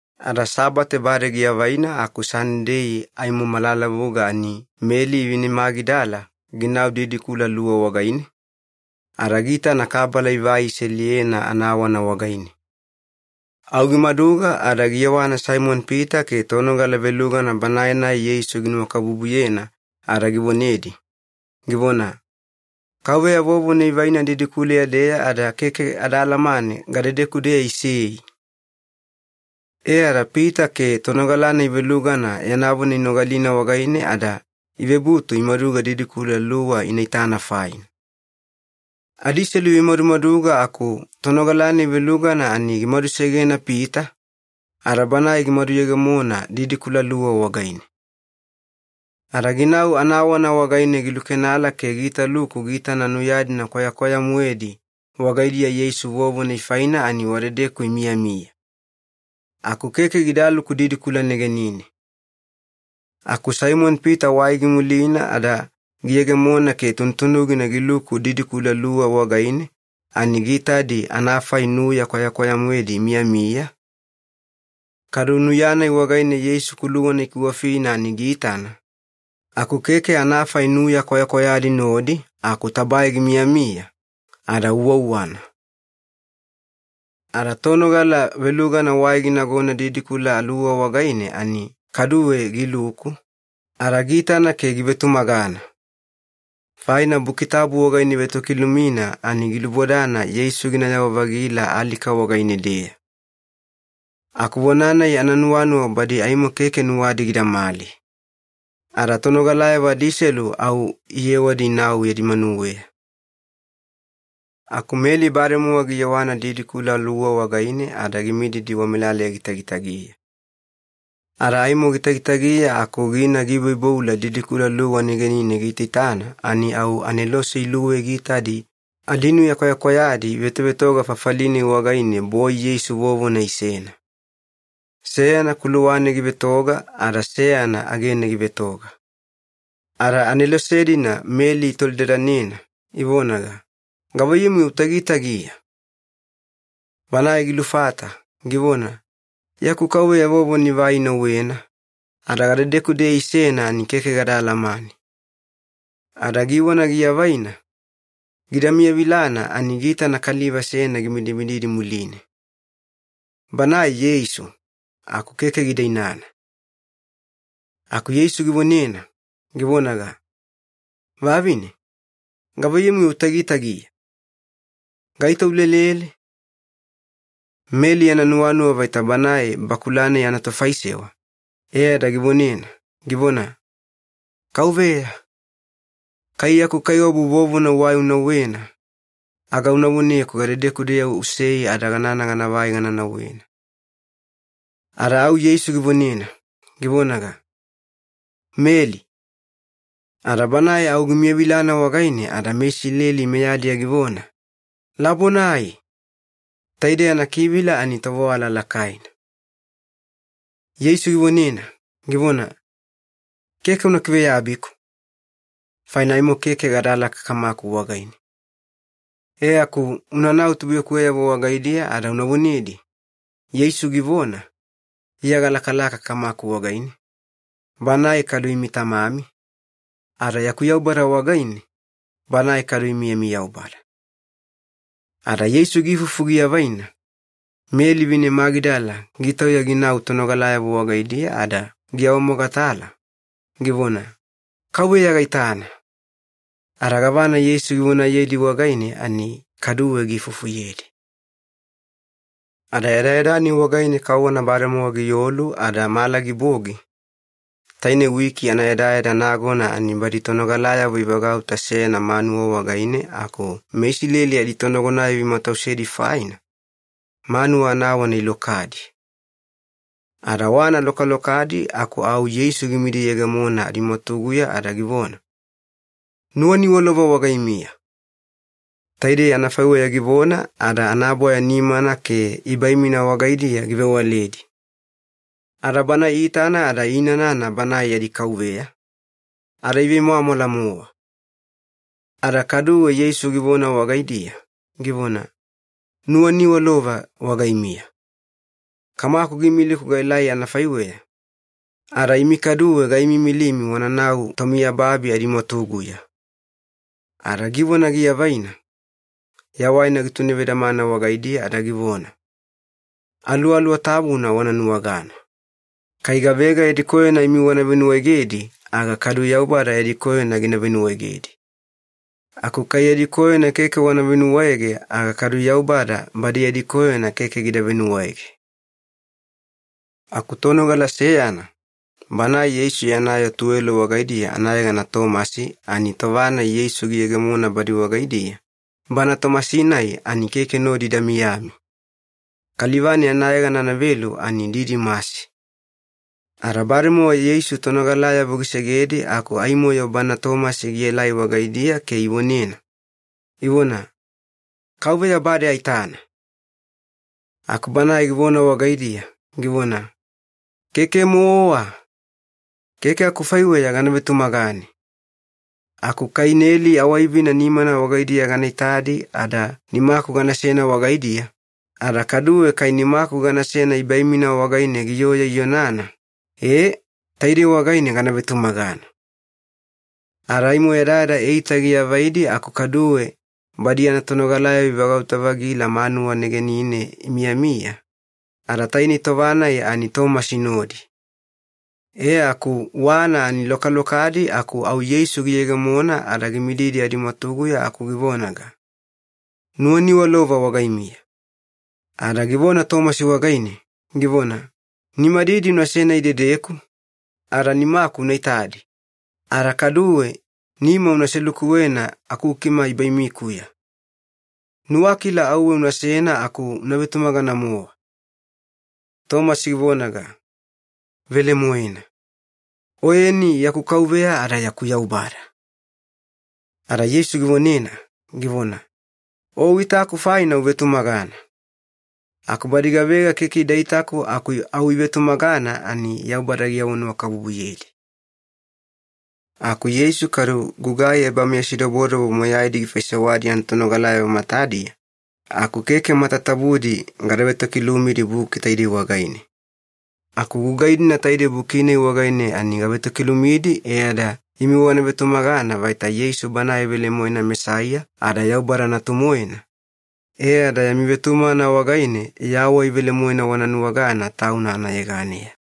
Ada Sabate bade giavaina aku Sanidei aimo malalavuga ani Meli vine Magidala ginau didikula luwa wagaine, ada giitana kabala ivai iseliyena anawana wagaine. Au gimaduga ada giyewana Saimoni-Pita ke tonogala velugana banae-nai Yeisu ginuwakabubuyena ada givonedi, givona, “Kauveya vovona ivaina didikuleya-deya ada keke ada alamane gadedeku-deya isei!” E ada Pita ke tonogala-nai velugana yana vona inogalina wagaine ada ivebutu imaduga didikula luwa ina itana faina. Adiselu ivemadumaduga aku tonogala-nai velugana ani gimadusegena Pita, ada banae gimaduyegemona didikula luwa wagaine. Ada ginau anawana wagaine gilukenala ke giitaluku giitana nuya-dina kwayakwaya-moedi wagaidiya Yeisu vovona ifaina ani wadedeku imiyamiya. Aku keke gidaluku didikula negenine. Aku Saimoni-Pita wai gimulina ada giyegemona ke tunutunugina giluku didikula luwa wagaine ani giitadi anafai nuya kwayakwaya-moedi imiyamiya, kadu nuya-nai wagaine Yeisu kuluwana ikiwafina ani giitana, aku keke anafai nuya kwayakwayadi nodi aku tabae gimiyamiya, ada uwauwana. Ada tonogala velugana wai ginagona didikula luwa wagaine ani kaduwe giluku, ada giitana ke givetumagana. Faina Buki Tabu wagaine ivetokilumina ani gilubodana Yeisu ginayawa-vagila alika wagaine-deya. Aku vona-nai ananuwanuwa badi aimo keke nuwadi gidamali. Ada tonogalayavo adiselu au iyewadi inau yadi manuweya. Aku Meli bademowa giyewana didikula luwa wagaine ada gimididi wamelaleya gitagitagiya. Ada aimo gitagitagiya aku gina giiboiboula didikula luwa negenina giitaitana ani au anelose iluwei giitadi adinuya kwayakwayadi ivetovetoga fafali-nai wagaine boi Yeisu vovona isena. Seyana kuluwane givetoga ada seyana agene givetoga. Ada anelose-dina Meli itolidadanena, ivonaga, “Gavaiyamu-yo utagitagiya?” Banae gilufata, givona, “Yaku Kauveya vovona ivai inauwena, ada gadedeku-deya isena ani keke gada alamane.” Ada givona giavaina, gida miyavilana ani giitana kaliva seyana gimidimididi muline. Banae Yeisu, aku keke gida inana. Aku Yeisu givonena, givonaga, “Vavine, gavaiyamu-yo utagitagiya? Gaito ulelele?” Meli yana nuwanuwa vaita banae bakula-nai anatofaisewa, e ada givonena, givona, “Kauveya, kai yaku Kaiwabu vovona uwai unauwena, aga una voneku gadedeku-deya usei ada ganana ganavai gana nauwena.” Ada au Yeisu givonena, givonaga, “Meli.” Ada banae au gimiyavilana wagaine ada meIsileli meyadiya givona, “Labonai!” Taidei anakivila ani ‘tovewala lakaina’. Yeisu givonena, givona, “Keke una kiveyabiku, faina aimo keke gadalaka Kamaku wagaine. E aku unanau tubuiyakuweyavo wagaidiya ada una vonedi, ‘Yeisu givona, Iya galakalaka Kamaku wagaine, Banae kadu imi Tamami, ada yaku Yaubada wagaine, Banae kadu imi yami Yaubada.’” Ada Yeisu giifufu giavaina, Meli vine Magidala gitauya ginau tonogalayavo wagaidiya ada giawamogatala, givona, “Kauveya gaitana!” Ada gavana Yeisu givonayedi wagaine ani kaduwe giifufuyedi. Ada yadayada-nai wagaine kauwana bademowa giolu ada mala gibogi, taine wiki anayadayada nagona ani badi tonogalayavo ivagauta seyana manuwa wagaine aku meIsileli aditonagonayavo imatausedi faina, manuwa anawana ilokadi. Ada wana lokalokadi aku au Yeisu gimidiyegemona adimwatuguya ada givona, “Nuwaniwalova wagaimiya!” Taidei anafaiweya givona ada anabwaya nimana ke ibaimina wagaidiya givewaledi. Ada Bana iitana ada iinanana Banae yadi Kauveya, ada ivemwamwala-mowa. Ada kaduwe Yeisu givona wagaidiya, givona, “Nuwaniwalova wagaimiya! Kamaku giimiliku gaelai anafaiweya, ada imi kaduwe gaimiimilimi wananau tomiyababi adimwatuguya.” Ada givona giavaina, yawaina gitunevedamana wagaidiya ada givona, “Aluwaluwa Tabuna wana nuwagana. Kai gavega yadi koyona imi wana venuwaegedi aga kadu Yaubada yadi koyona gina venuwaegedi. Aku kai yadi koyona keke wana venuwaege aga kadu Yaubada badi yadi koyona keke gida venuwaege.” Aku tonogala seyana, banae Yeisu yana yoo tuwelo wagaidiya anayegana Tomasi ani tova-nai Yeisu giyegemona badi wagaidiya, bana Tomasi-nai ani keke nodi ida miyami. Kaliva-nai anayegana anavelu ani Didimasi. Ada bademowa Yeisu tonogalayavo gisegedi aku aimo-yo bana Tomasi gielai wagaidiya ke ivonena, ivona, “Kauveya bade aitana!” Aku banae givona wagaidiya, givona, “Keke-mowa! Keke akufaiweya gana vetumagane. Aku kai neli awaivina nimana wagaidiya gana itadi ada nimaku ganasena wagaidiya, ada kaduwe kai nimaku ganasena ibaimina wagaine giyoya ionana, e, taidei wagaine gana vetumagana.” Ada aimo yadayada eita giavaidi aku kaduwe badi yana tonogalayavo ivagauta-vagila manuwa negenine imiyamiya, ada tainei tova-nai ani Tomasi nodi. E aku wana ani lokalokadi aku au Yeisu giyegemona ada gimididi adimwatuguya aku givonaga, “Nuwaniwalova wagaimiya.” Ada givona Tomasi wagaine, givona, “Nimadidi unasena idedeku, ada nimaku una itadi, ada kaduwe nima una selukuwena akukima ibaimikuya. Nuwakila auwe unasena aku una vetumagana-mowa.” Tomasi givonaga, “Velemoena. Oyeni yaku Kauveya ada yaku Yaubada!” Ada Yeisu givonena, givona, “O uitaku faina uvetumagana. Aku badi gavega keke ida itaku aku au ivetumagana ani Yaubada giawanuwakabubuyedi.” Aku Yeisu kadu gugai ebameyasidobodobo moyaidi gifaisewadi yana tonogalayavo matadiya, aku keke matatabudi gada vetokilumidi buki taidei wagaine. Aku gugai-dina taidei buki-nai wagaine ani gavetokilumidi e ada imi wana vetumagana vaita Yeisu Banae velemoena Mesaiya ada Yaubada Natu-moena, e ada yami vetumagana wagaine yawai velemoena wana nuwagana Tauna anayeganeya.